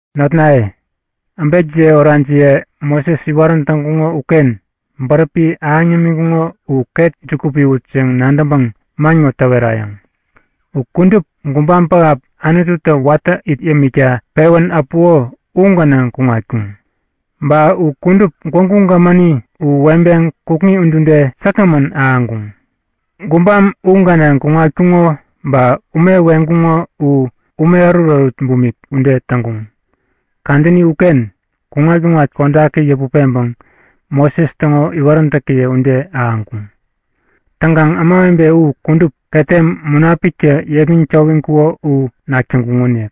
Notnaye, äbekjiye orajiye Moses iwarän täŋkuŋo uken bäräpi ahäŋ yämiŋkuŋo u ket juku piwut yäŋ nadäŋpäŋ man ŋo täwerayäŋ; U kudup gubam pähap Anututä watä it yämikta pewän äpuko u gänaŋ kuŋatkuŋ. Ba u kudup Gwägu Gämäni u weŋpeŋ kukŋi udude säkgämän ahäŋkuŋ. Gubam u gänaŋ kuŋatkuŋo ba ume weŋkuŋo u ume ärutärut bumik ude täŋkuŋ. Kadäni uken kuŋat-kuŋat kodaki yäput peŋpäŋ Moses täŋo iwaräntäkiye ude ahäŋkuŋ. Täŋkaŋ ämawebe u kudup ketem Munapiktä yepmäŋ towiŋkuko u nak täŋkuŋonik.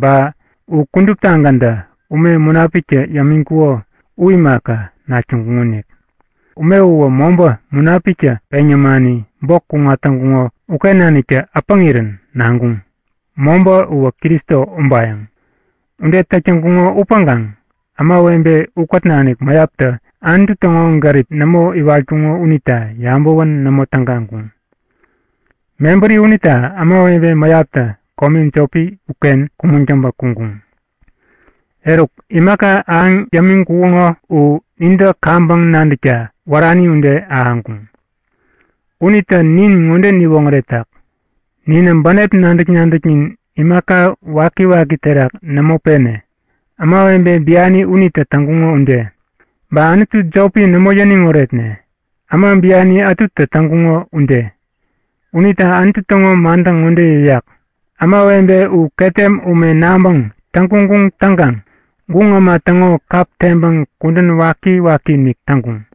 Ba u kuduptagäntä ume Munapiktä yämiŋkuko u imaka, nak täŋkuŋonik. Ume uwä mobä Munapiktä peŋ yämani bok kuŋat täŋkuŋo uken naniktä äpäŋirän naŋkuŋ. Mobä uwä Kristo ubayäŋ. Ude täk täŋkuŋo upäŋkaŋ ämawebe ukät nanik mäyaptä Anutu täŋo gärip nämo iwatkuŋo unita yabäwän nämo tägaŋkuŋ. Mebäri unita ämawebe mäyaptä kome jopi uken kumäŋ täŋpä kuŋkuŋ. Eruk, imaka ahäŋ yämiŋkuŋo u nintä kaŋpäŋ nadäkta wärani ude ahäŋkuŋ. Unitä nin ŋode niwoŋäretak; Ninä bänep nadäk-nadäknin imaka wakiwaki terak nämo pene, ämawebe biani unitä täŋkuŋo ude. Ba anutu jopi nämo yäniŋ oretne, äma biani ätutä täŋkuŋo ude. Unita Anutu täŋo mantä ŋode yäyak; Ämawebe u ketem ume naŋpäŋ täŋguŋguŋ täŋkaŋ guŋ äma täŋo kap teŋpäŋ kudän waki-wakiinik täŋkuŋ.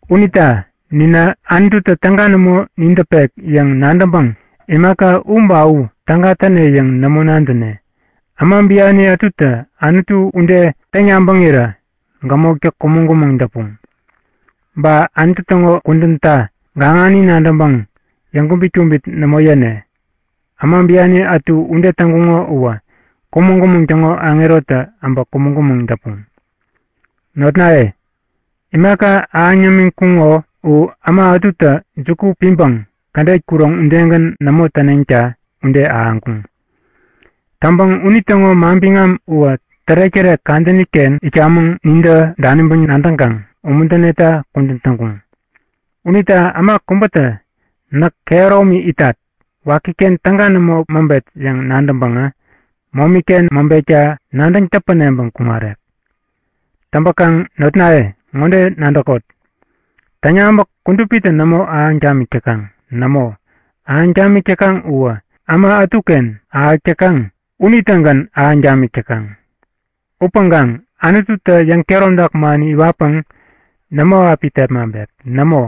Unita ninä Anututä täga nämo nin däpek yäŋ nadäŋpäŋ imaka u ba u täga täne yäŋ nämo nadäne. Äma biani ätutä Anutu ude täŋ-yabäŋirä gämoktä kumäŋ-kumäŋ däpuŋ. Ba Anutu täŋo kudänta gaŋani nadäŋpäŋ yäŋkubit-kubit nämo yäne. Äma biani ätu ude täŋkuŋo uwä Kumäŋ-kumäŋ täŋo Aŋerotä äbä kumäŋ-kumäŋ däpuŋ. Notnaye, imaka ahäŋ yämiŋkuŋo u äma ätutä juku piŋpäŋ kädet kuroŋ udegän nämo täneŋta ude ahäŋkuŋ. Täŋpäŋ unitäŋo manbiŋam uwä tärek-tärek kadäni-ken itkamäŋ nintä daniŋpäŋ nadäŋkaŋ umuntäneta kudän täŋkuŋ. Unita äma kubätä näk kehäromi itat, wakiken täga nämo mäŋpet yäŋ nadäŋpäŋä momi-ken mäŋpekta nadäŋ täpäneŋpäŋ kuŋarek. Täŋpäkaŋ notnaye ŋode nadäkot; Täŋyabäk kudupitä nämo ahäŋ tamik täkaŋ. Nämo, ahäŋ tamik täkaŋ uwä äma ätuken ahäk täkaŋ unitägän ahäŋ tamik täkaŋ. Upäŋkaŋ Anututä yäŋkehäromtak mani iwatpäŋ nämo api tepmaŋpek. Nämo,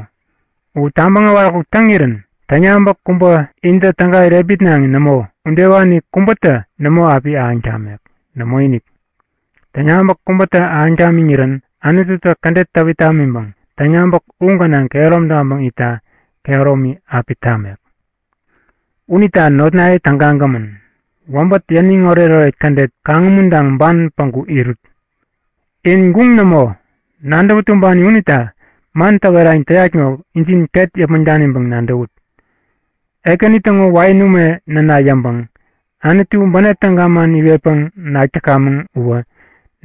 u tabäŋ äwaräkuk täŋirän täŋyabäk kubä intä täga irepmitnaŋi nämo, udewani kubätä nämo api ahäŋ tamek. Nämoinik! Täŋyabäk kubätä ahäŋ tamiŋirän Anututä kädet täwit tamiŋpäŋ täŋyabäk u gänaŋ kehärom taŋpäŋ itta kehäromi api tamek. Unita notnaye tägagämän, wäbät yäniŋ oretoret kädet kaŋumuntaŋ ban päŋku irut. In guŋ nämo, nadäwä tumbani unita man täwerayäŋ täyat ŋo injin ket yäpmäŋ daniŋpäŋ nadäwut. Ekäni täŋo wain ume näna yäŋpäŋ Anutu bänep täga man iwetpäŋ nak täkamäŋ uwä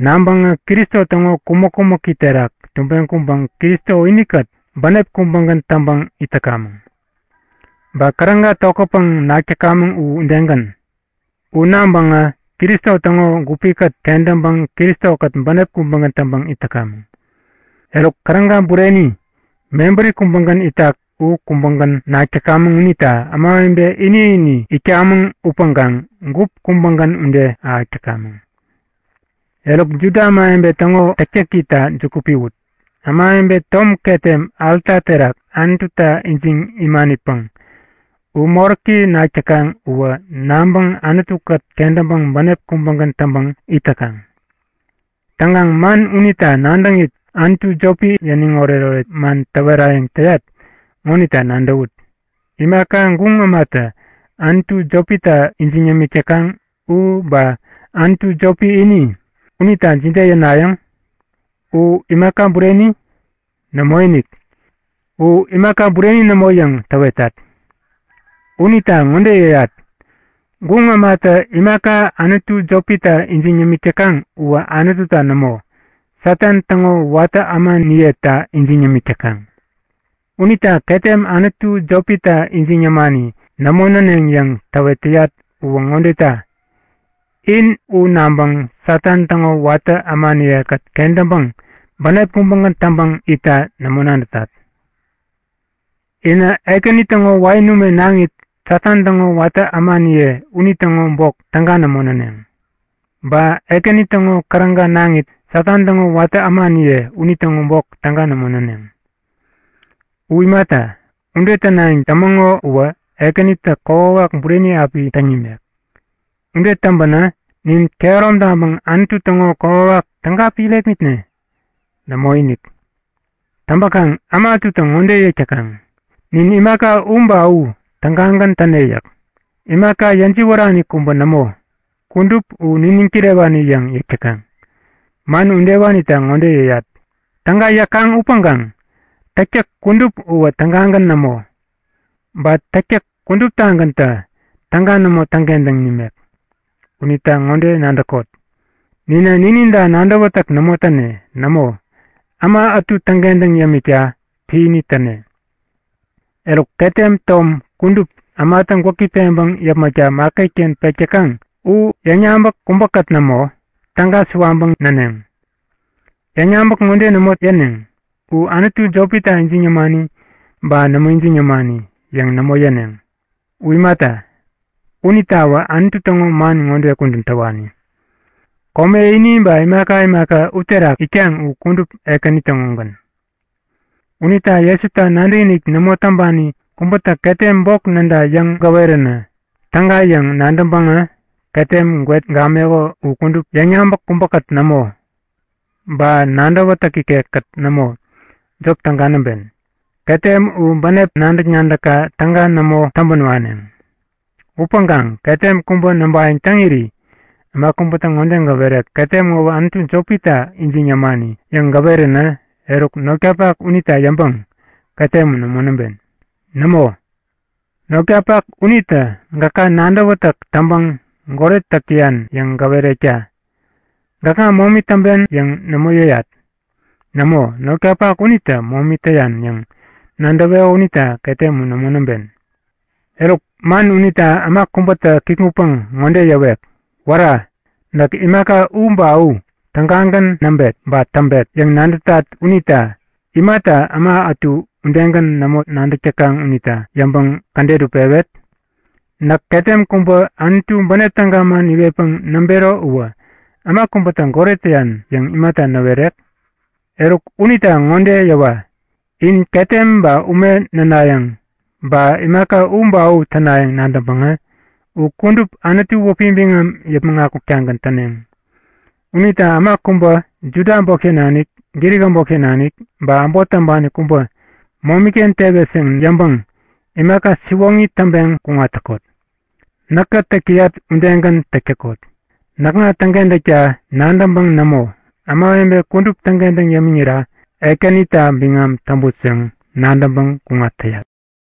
naŋpäŋä Kristo täŋo kumäk-kumäki terak tubeŋ kuŋpäŋ Kristo inikät bänep kubägän täŋpäŋ it täkamäŋ. Ba käräga tokätpäŋ nak täkamäŋ u udegän. U naŋpäŋä Kristo täŋo gupikät kentäŋpäŋ Kristo-kät bänep kubägän täŋpäŋ it täkamäŋ. Eruk, käräga bureni mebäri kubägän itak u kubägän nak täkamäŋ unita ämawebe ini-ini itkamäŋ upäŋkaŋ gup kubägän ude ahäk täkamäŋ. Eruk, Juda ämawebe täŋo täktäkita juku piwut; Ämawebe tom ketem alta terak Anututa ijiŋ imanipäŋ u moräki nak täkaŋ uwä naŋpäŋ Anutu-kät kentäŋpäŋ bänep kubägän täŋpäŋ it täkaŋ. Täŋkaŋ man unita nadäŋit anutu jopi yäniŋoret-oret man täwerayäŋ täyat ŋonita nadäwut; Imaka guŋ ämatä anutu jopita ijiŋ yämik täkaŋ u ba anutu jopi ini, unita jide yänayäŋ? U imaka bureni? Nämoinik! U imaka bureni nämo yäŋ täwetat. Unita ŋode yäyat; Guŋ ämatä imaka anutu jopita ijiŋ yämik täkaŋ uwä Anututa nämo, Satan täŋo watä ämaniyeta ijiŋ yämik täkaŋ. Unita ketem anutu jopita ijiŋ yämani nämo näneŋ yäŋ täwet täyat uwä ŋodeta; In u naŋpäŋ Satan täŋo watä ämaniye-kät kentäŋpäŋ bänep kubägän täŋpäŋ itta nämo nadätat. Inä Ekäni täŋo wain ume naŋit, Satan täŋo watä ämaniye unitäŋo bok täga nämo näneŋ. Ba Ekäni täŋo käräga naŋit, Satan täŋo watä ämaniye unitäŋo bok täga nämo näneŋ. U imata, ude tänayäŋ tämäŋo uwä Ekänitä kokwawak bureni api täŋ nimek. Ude täŋpänä nin kehärom taŋpäŋ Anutu täŋo kokwawak täga api irepmitne? Nämoinik! Täŋpäkaŋ äma ätutä ŋode yäk täkaŋ; Nin imaka u ba u tägagän täne yäk. Imaka yäjiwärani kubä nämo, kudup u niniŋ kirewani yäŋ yäk täkaŋ. Man udewanita ŋode yäyat; Täga yäkaŋ upäŋkaŋ täktäk kudup uwä tägagän nämo. Ba täktäk kuduptagäntä täga nämo täŋkentäŋ nimek. Unita ŋode nadäkot; Ninä nininta nadäwätäk nämo täne. Nämo, äma ätu täŋkentäŋ yämikta piäni täne. Eruk, ketem tom kudup ämatä gwäki peŋpäŋ yäpmäkta maketken pek täkaŋ u yäŋyabäk kubäkät nämo, täga suwaŋpäŋ näneŋ. Yäŋyabäk ŋode nämo yäneŋ; U anutu jopita ijiŋ yämani ba nämo ijiŋ yämani yäŋ nämo yäneŋ. U imata, unitawä Anutu täŋo man ŋode kudän täwani; Kome ini ba imaka imaka uterak itkaŋ u kudup Ekäni täŋogän. Unita Jesuta nadäkinik nämo täŋpani kubätä ketem bok näda yäŋ gäwerän täga yäŋ nadäŋpäŋä ketem gwet gameko u kudup yäŋyabäk kubäkät nämo, ba nadäwätäk ikekkät nämo, jop täga näŋpen. Ketem u bänep nadäk-nadäkka täga nämo täŋpän waneŋ. Upäŋkaŋ ketem kubä näŋpayäŋ täŋiri äma kubätä ŋode gäwerek; Ketem ŋowä anutu jopita ijiŋ yämani yäŋ gäweränä eruk, notkapak unita yäŋpäŋ ketem u nämo näŋpen. Nämo, notkapak unitä gäka nadäwätäk täŋpäŋ goret täk täyan yäŋ gäwerekta! Gäkŋa momi täŋpen yäŋ nämo yäyat. Nämo, notkapak unitä momi täyan yäŋ nadäweko unita ketem u nämo näŋpen. Eruk, man unita äma kubätä kikŋutpäŋ ŋode yäwek; Wära! Näk imaka u ba u tägagän näŋpet ba täŋpet yäŋ nadätat unita imata äma ätu udegän nämo nadäk täkaŋ unita yäŋpäŋ kädet u pewet? Näk ketem kubä Anutu bänep täga man iwetpäŋ näŋpero uwä äma kubätä goret näyan yäŋ imata näwerek? Eruk unita ŋode yäwa; In ketem ba ume nänayäŋ, ba imaka u ba u tänayäŋ nadäŋpäŋä u kudup Anutu wäpi biŋam yäpmäŋ akuktagän täneŋ. Unita äma kubä, Juda äbotken nanik, Grik äbotken nanik, ba äbot täŋpani kubä momi-ken tewet yäŋ yäŋpäŋ imaka siwoŋi täŋpeŋ kuŋat täkot. Näkä täk täyat udegän täk täkot; Näkŋa täŋkentäkta nadäŋpäŋ nämo, ämawebe kudup täŋkentäŋ yämiŋira Ekänita biŋam täŋput yäŋ nadäŋpäŋ kuŋat täyat.